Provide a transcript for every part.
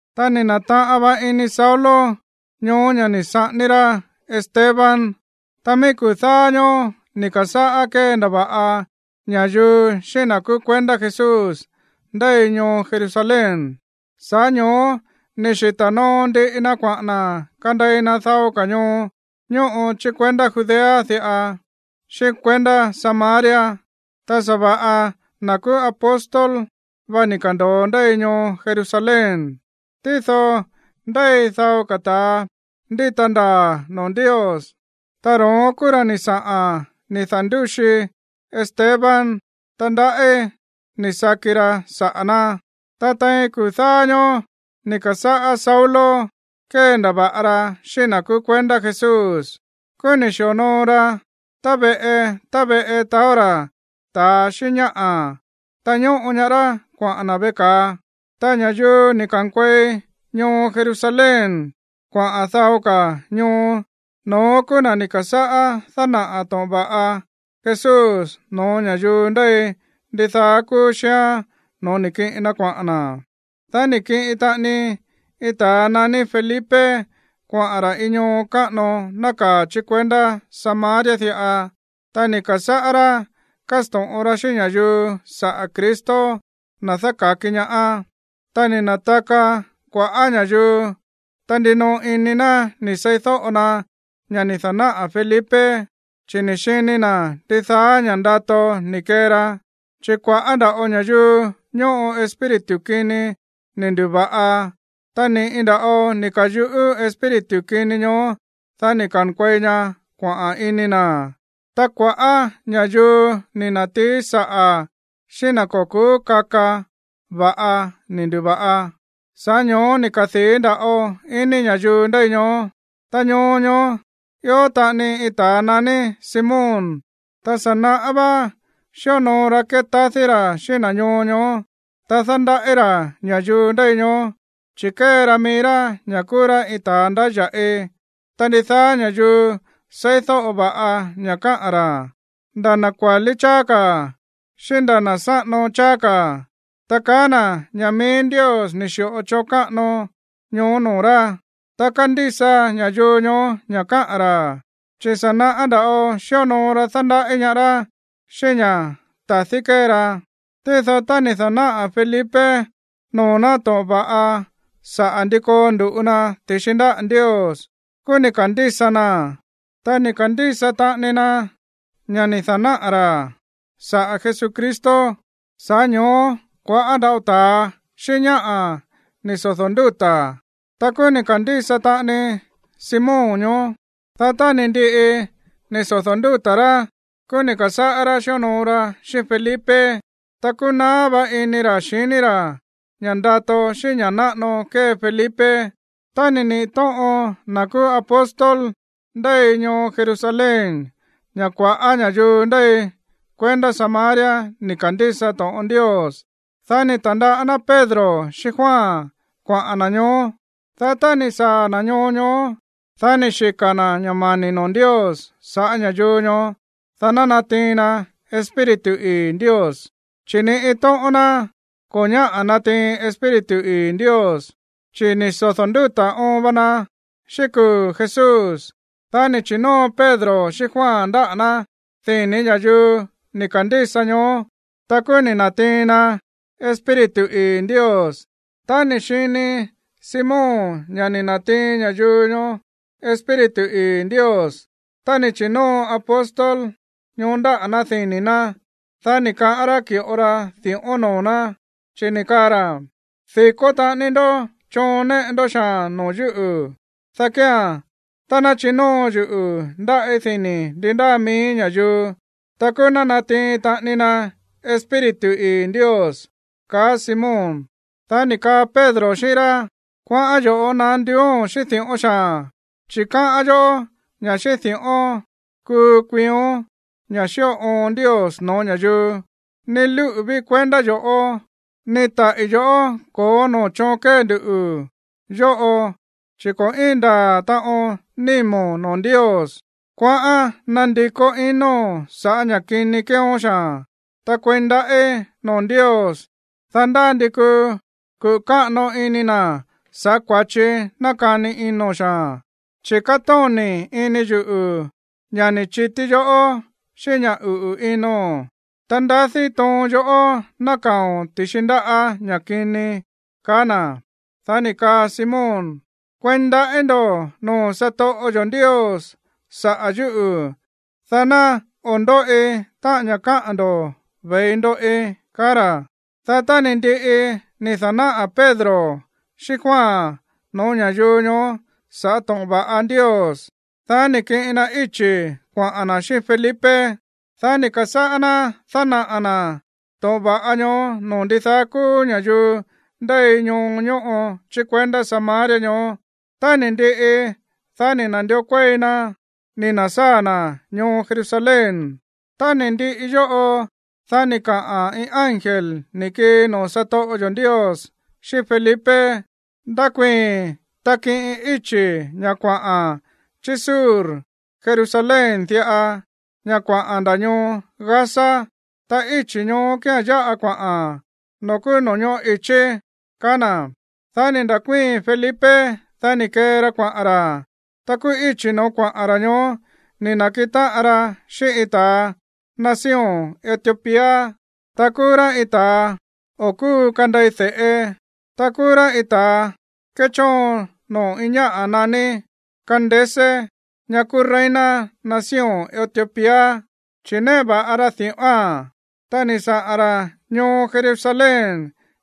Ta ni̱ na̱taꞌan va ini Saulo ñoó ña̱ ni̱ saꞌání rá Esteban. Ta mií kuu̱ dáá ñóó ni̱ ka̱sáꞌá kéndava̱ꞌa ña̱yuu xíꞌín na̱ kúú kuendá Jesús ndéi ñoo Jerusalén. Sa̱ꞌá ño̱ó ni̱ xita̱ noo ndiꞌi na kuaꞌa̱n na̱ kandei na dao ka̱ ñoo ñóꞌo chí kuendá Judea diꞌa xíꞌín kuendá Samaria. Ta sa̱va̱ꞌa na̱ kúú apóstol va ni̱ ka̱ndo̱o ndéi ñoo Jerusalén. Tído ndéi dao ka̱ ta̱a ndíta ndaa̱ noo̱ Ndios, ta ro̱ón kúú ra̱ ni̱ saꞌa̱n ni̱ da̱ndúxi Esteban. Ta ndaꞌí ni̱ saki ra saꞌa̱ ná. Ta tein kuu̱ dáá ñóó ni̱ ka̱sáꞌá Saulo kéndava̱ꞌa ra xíꞌín na̱ kúú kuendá Jesús. Kúú ni̱ xi̱onoo ra tá veꞌe tá veꞌe taó ra̱ ta̱a xíꞌín ñáꞌa̱, ta ñóꞌo ñaá rá kuaꞌa̱n na̱ veꞌe ka̱a. Ta ña̱yuu ni̱ ka̱nkuei ñoo Jerusalén kuaꞌa̱n dao ka̱ ñoo, no̱ón kúú na̱ ni̱ ka̱sáꞌá dánaꞌa̱ to̱ꞌon va̱ꞌa Jesús no̱ó ña̱yuu ndéi ndidaá kúú xíán no̱ó ni̱ kiꞌin na kuaꞌa̱n na̱. Dá ni̱ kiꞌin taꞌani iin ta̱a naní Felipe kuaꞌa̱n ra̱ iin ñoo káꞌano nákaa̱ chí kuendá Samaria diꞌa, ta ni̱ ka̱sáꞌá rá kásto̱ꞌon ra xíꞌín ña̱yuu saꞌa̱ Cristo, na̱ dáka̱ki ñaá. Ta ni̱ na̱taka kua̱ꞌá ña̱yuu. Ta ndinoꞌo ini na̱ ni̱ seídóꞌo na ña̱ ni̱ da̱náꞌa̱ Felipe, chi̱ ni̱ xini na̱ ndidaá ña̱ꞌa ndato ni̱ kee ra. Chi̱ kua̱ꞌá nda̱ꞌo ña̱yuu ñóꞌo espíritu kini ni̱ ndu̱va̱ꞌa, ta ni̱ꞌi nda̱ꞌo ni̱ ka̱yuꞌú espíritu kini ñoó, dá ni̱ ka̱nkuei ña kuaꞌa̱n ini na̱. Ta kua̱ꞌá ña̱yuu ni̱ na̱tií saꞌa̱ xíꞌín na̱ ko̱ ku̱ú kaka va̱ꞌa ni̱ ndu̱va̱ꞌa. Sa̱ꞌá ño̱ó ni̱ kadii̱ nda̱ꞌo ini ña̱yuu ndéi ñoó. Ta ñoo ñoó ió taꞌani iin ta̱a naní Simón, ta sa̱ naꞌá vá xíonoo ra kétadí ra̱ xíꞌín na̱ ñoo ñoó. Ta dándaꞌí ra̱ ña̱yuu ndéi ñoó, chi̱ kée ra mií rá ña̱ kúú rá iin ta̱a ndáya̱ꞌi. Ta ndidaá ña̱yuu seídóꞌo va̱ꞌa ña̱ káꞌa̱n ra̱, nda̱ na̱ kuálí cháá ka̱ xíꞌín nda̱ na̱ sáꞌano cháá ka̱, ta kaá na̱ ña̱ mií Ndios ni̱ xi̱ꞌo choon káꞌano ñoó noo̱ rá. Ta kándísa ña̱yuu ñoó ña̱ káꞌa̱n ra̱, chi̱ sa̱ naꞌá nda̱ꞌo xíonoo ra dándaꞌí ñaá rá xíꞌín ña̱ ta̱dí kée ra. Tído tá ni̱ da̱náꞌa̱ Felipe noo̱ ná to̱ꞌon va̱ꞌa saꞌa̱ ndi koo ndu̱ꞌu na ti̱xi ndáꞌa̱ Ndios, kúú ni̱ ka̱ndísa naa̱n, ta ni̱ ka̱ndísa taꞌani na ña̱ ni̱ da̱náꞌa̱ ra̱ saꞌa̱ Jesucristo. Sa̱ꞌá ño̱ó kua̱ꞌá nda̱ꞌo ta̱a xíꞌín ñáꞌa̱ ni̱ sodo̱ ndúta̱. Ta kúú ni̱ ka̱ndísa taꞌani Simón ñoó. Dá tá ni̱ ndiꞌi ni̱ sodo̱ ndúta̱ rá, kúú ni̱ ka̱sáꞌá rá xíonoo ra xíꞌín Felipe. Ta kúú naá vá iní ra̱ xiní ra̱ ña̱ ndato xíꞌín ña̱ náꞌano kée Felipe. Tá ni̱ niꞌi̱ tóꞌon na̱ kúú apóstol ndéi ñoo Jerusalén ña̱ kua̱ꞌá ña̱yuu ndéi kuendá Samaria ni̱ ka̱ndísa to̱ꞌon Ndios, dá ni̱ ta̱ndaꞌá ná Pedro xíꞌín Juan kuaꞌa̱n na̱ ñoó. Dá tá ni̱ saa̱ na̱ ñoo ñoó, dá ni̱ xika̱ na̱ ña̱ mani̱ noo̱ Ndios sa̱ꞌá ña̱yuu ñoó, dá ná natiin na Espíritu ii̱ Ndios, chi̱ ni iin tóꞌón ná ko̱ ñáꞌa̱ natiin Espíritu ii̱ Ndios, chi̱ ni̱ sodo̱ ndúta̱ óon va na xíꞌín kuu̱ Jesús. Dá ni̱ chi̱nóo Pedro xíꞌín Juan ndáꞌa̱ ná dini̱ ña̱yuu ni̱ ka̱ndísa ñoó, ta kúú ni̱ na̱tiin na Espíritu ii̱ Ndios. Tá ni̱ xini Simón ña̱ ni̱ na̱tiin ña̱yuu ñoó Espíritu ii̱ Ndios tá ni̱ chi̱nóo apóstol ñoó ndáꞌa̱ ná dini̱ ná, dá ni̱ kaꞌán rá ki̱ꞌo ra di̱ꞌón noo̱ ná, chi̱ ni̱ kaa ra̱: ―Di̱kó taꞌani ndoꞌó choon néꞌe ndó xaa̱n noo̱ yúꞌu̱. Dá kía̱n, tá ná chinóo yuꞌu̱ ndáꞌí dini̱ ndi ndáa mií ña̱yuu, ta kúú ná natiin taꞌani na Espíritu ii̱ Ndios ―kaá Simón. Dá ni̱ kaa Pedro xíꞌín rá: ―Kuaꞌán yo̱ꞌó naá nduúo̱n xíꞌín di̱ꞌón xaa̱n, chi̱ káꞌán yoꞌó ña̱ xíꞌín di̱ꞌón kuu kuiión ña̱ xíꞌo oon Ndios no̱ó ña̱yuu. Ni lúꞌu̱ ví kuendá yo̱ꞌó, ni táꞌí yoꞌó ko̱ó noo̱ choon kée nduꞌu̱ yóꞌo chi̱ ko̱ íin ndaa̱ taꞌon nímo̱n noo̱ Ndios. Kuaꞌán nandikó inóo̱n saꞌa̱ ña̱ kini kéeón xaa̱n. Ta kueí ndaꞌí noo̱ Ndios, dá ndá ndi kuu kuꞌu̱ káꞌano ini na̱ sa̱ꞌá kua̱chi nákani ino̱n xaa̱n. Chi̱ kátóni̱ ini yuꞌu̱ ña̱ ni̱ chití yoꞌó xíꞌín ña̱ uꞌu̱ ino̱n. Ta ndadí toon yoꞌó nákaa̱o̱n ti̱xi ndáꞌa̱ ña̱ kini ―kaá na̱. Dá ni̱ kaa Simón: ―Kueí ndaꞌí ndo̱ noo̱ satoꞌo yo̱ Ndios saꞌa̱ yúꞌu̱, dá ná o̱ ndóꞌi táꞌa̱n ña̱ kaá ndo̱ ve̱i ndoꞌi ―kaá ra̱. Dá tá ni̱ ndiꞌi ni̱ da̱náꞌa̱ Pedro xíꞌín Juan no̱ó ña̱yuu ñoó sa̱ꞌá to̱ꞌon va̱ꞌa Ndios, dá ni̱ kiꞌin na íchi̱ kuaꞌa̱n na̱ xíꞌín Felipe. Dá ni̱ ka̱sáꞌá ná dánaꞌa̱ na̱ to̱ꞌon va̱ꞌa ñoó noo̱ ndidaá kúú ña̱yuu ndéi ñoo ñóꞌo chí kuendá Samaria ñoó. Tá ni̱ ndiꞌi, dá ni̱ na̱ndió kuéi na ni̱ na̱sáa̱ na̱ ñoo Jerusalén. Tá ni̱ ndiꞌi yóꞌo, dá ni̱ kaꞌa̱n iin ángel ni̱ kii noo̱ satoꞌo yo̱ Ndios xíꞌín Felipe: ―Ndakuii̱n, ta kiꞌin íchi̱ ña̱ kuaꞌa̱n chí sur Jerusalén diꞌa, ña̱ kuaꞌa̱n nda̱ ñoo Gaza. Ta íchi̱ ñoó kía̱n yáꞌa kuaꞌa̱n noo̱ kúú no̱ñoꞌó i̱chí ―kaá na̱. Dá ni̱ nda̱kuíi̱n Felipe. Dá ni̱ kee ra kuaꞌa̱n ra̱. Ta kúú íchi̱ no̱ó kuaꞌa̱n ra̱ ñoó ni̱ na̱kiꞌin táꞌan ra xíꞌín iin ta̱a nación Etiopía. Ta kúú rá iin ta̱a o̱ kúu kandei de̱ꞌe. Ta kúú rá iin ta̱a kéchóon noo̱ iin ñáꞌa̱ naní Candace, ña̱ kúú reina nación Etiopía, chi̱ néꞌe va̱ꞌa ra di̱ꞌóa̱n. Ta ni̱ saꞌa̱n ra̱ ñoo Jerusalén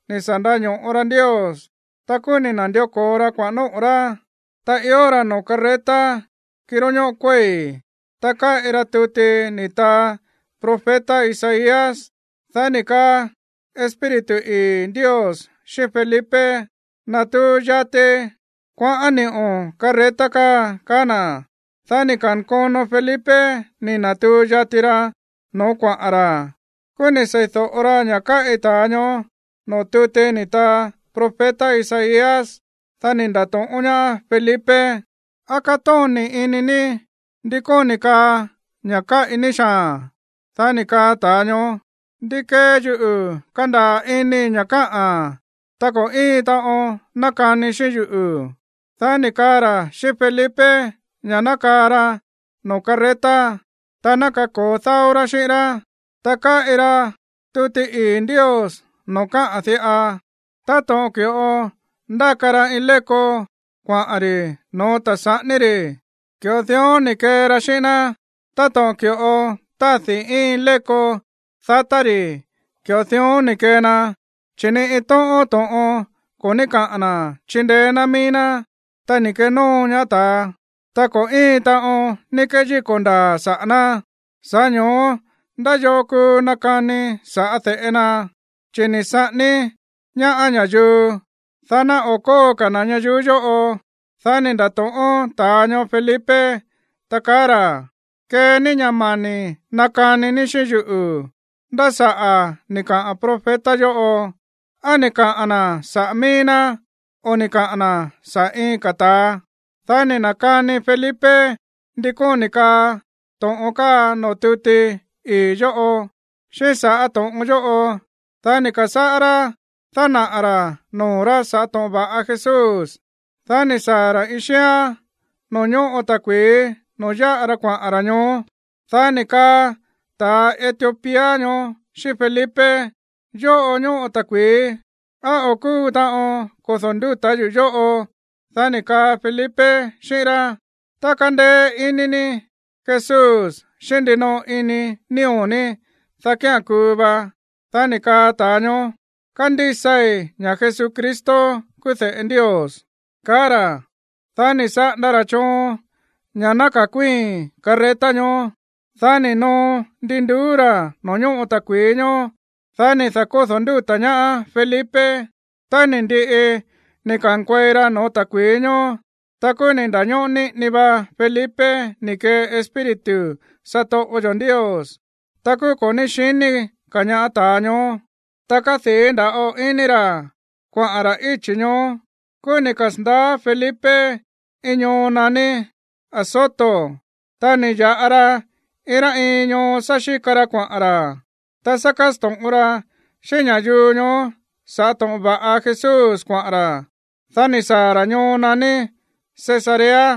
ni̱ sa̱ ndaño̱ꞌo ra Ndios. Ta kúú ni̱ na̱ndió ko̱o ra kuaꞌa̱n nóꞌo̱ rá. Ta ió ra̱ noo̱ carreta, kiró ñóꞌo kuéi̱. Ta káꞌi ra tuti ni̱ taa profeta Isaías. Dá ni̱ kaa Espíritu ii̱ Ndios xíꞌín Felipe: ―Natuu yati kuaꞌán ni̱ꞌo̱n carreta káa ―kaá na̱. Dá ni̱ ka̱nkono Felipe ni̱ na̱tuu yati ra no̱ó kuaꞌa̱n ra̱. Kúú ni̱ sei̱do̱ꞌo ra ña̱ káꞌi ta̱a ñoó noo̱ tuti ni̱ taa profeta Isaías. Dá ni̱ nda̱to̱ꞌón ñaá Felipe: ―¿Á kátóni̱ ini ní ndí kóni̱ kaa ña̱ káꞌi ní xaa̱n? Dá ni̱ kaa ta̱a ñoó: ―¿Ndi kee yuꞌu̱ kandaa̱ inii̱ ña̱ káꞌa̱n tá ko̱ íin taꞌon nakani xíꞌín yuꞌu̱? Dá ni̱ kaꞌa̱n ra̱ xíꞌín Felipe ña̱ ná kaa ra noo̱ carreta, ta ná kako̱o dáó rá xíꞌín rá. Ta káꞌi ra tuti ii̱ Ndios noo̱ káꞌa̱n diꞌa: Táto̱ꞌon ki̱ꞌo ndáka ra iin léko kuaꞌa̱n ri̱ no̱ó ta̱a saꞌání ri̱, ki̱ꞌo dión ni̱ kee ra xíꞌín ná. Táto̱ꞌon ki̱ꞌo tádi̱ iin léko dátá ri̱, ki̱ꞌo dión ni̱ kee na, chi̱ ni iin tóꞌón to̱ꞌon ko̱ ní káꞌa̱n na̱ chindeé ná mií ná. Ta ni̱ kenóo ñaá ta̱a, ta ko̱ íin taꞌon ní kéyíko̱ ndaa̱ saꞌa̱ ná. Sa̱ꞌá ño̱ó, ¿ndá yoo kuu nakani sa̱ꞌá de̱ꞌe na? Chi̱ ni̱ saꞌání ñaá ña̱yuu, dá ná o̱ kóo ka̱ na̱ ñayuú yóꞌo. Dá ni̱ nda̱to̱ꞌón ta̱a ñoó Felipe, ta kaá ra̱: ―Kee ní ña̱ mani̱ nakani ní xíꞌín yuꞌu̱. ¿Ndá saꞌa̱ ni̱ kaꞌa̱n profeta yóꞌo? ¿Á ni̱ kaꞌa̱n na̱ saꞌa̱ mií ná, o ni̱ kaꞌa̱n na̱ saꞌa̱ iin ka̱ ta̱a? Dá ni̱ na̱kani Felipe ndi kóni̱ kaa to̱ꞌon káa noo̱ tuti ii̱ yóꞌo. Xíꞌín sa̱ꞌá to̱ꞌon yóꞌo, dá ni̱ ka̱sáꞌá rá dánaꞌa̱ ra̱ noo̱ rá sa̱ꞌá to̱ꞌon va̱ꞌa Jesús. Dá ni̱ saa̱ ra̱ iin xíán noo̱ ñóꞌo ta̱kui̱í noo̱ yáꞌa ra kuaꞌa̱n ra̱ ñoó. Dá ni̱ kaa ta̱a Etiopía ñoó xíꞌín Felipe: ―Yóꞌo ñóꞌo ta̱kui̱í. ¿Á o̱ kúu taꞌon kodo̱ ndúta̱ yuꞌu̱ yóꞌo? Dá ni̱ kaa Felipe xíꞌín rá: ―Tá kandeé iní ní Jesús xíꞌín ndinoo ini nío̱ ní, dá kía̱n kuu va. Dá ni̱ kaa ta̱a ñoó: ―Kándísai ña̱ Jesucristo kúú de̱ꞌe Ndios ―kaá ra̱. Dá ni̱ saꞌanda ra̱ choon ña̱ ná ka̱kuíi̱n carreta ñoó. Dá ni̱ noo ndi nduú ra̱ noo̱ ñóꞌo ta̱kui̱í ñoó. Dá ni̱ da̱kódo̱ ndúta̱ ñaá Felipe. Tá ni̱ ndiꞌi ni̱ ka̱nkuei ra no̱ó ta̱kui̱í ñoó, ta kúú ni̱ nda̱ñóꞌó niꞌini va Felipe ni̱ kee Espíritu satoꞌo yo̱ Ndios. Ta kúú ko̱ ní xiní ka̱ ñaá ta̱a ñoó. Ta kádii̱ nda̱ꞌo ini ra̱ kuaꞌa̱n ra̱ íchi̱ ñoó. Kúú ni̱ kasa̱ndaá Felipe iin ñoo naní Azoto. Ta ni̱ ya̱ꞌa ra iin rá iin ñoo sá xíka ra kuaꞌa̱n ra̱, ta sá kásto̱ꞌon ra̱ xíꞌín ña̱yuu ñoó sa̱ꞌá to̱ꞌon va̱ꞌa Jesús kuaꞌa̱n ra̱. Dá ni̱ saa̱ ra̱ ñoo naní Cesarea.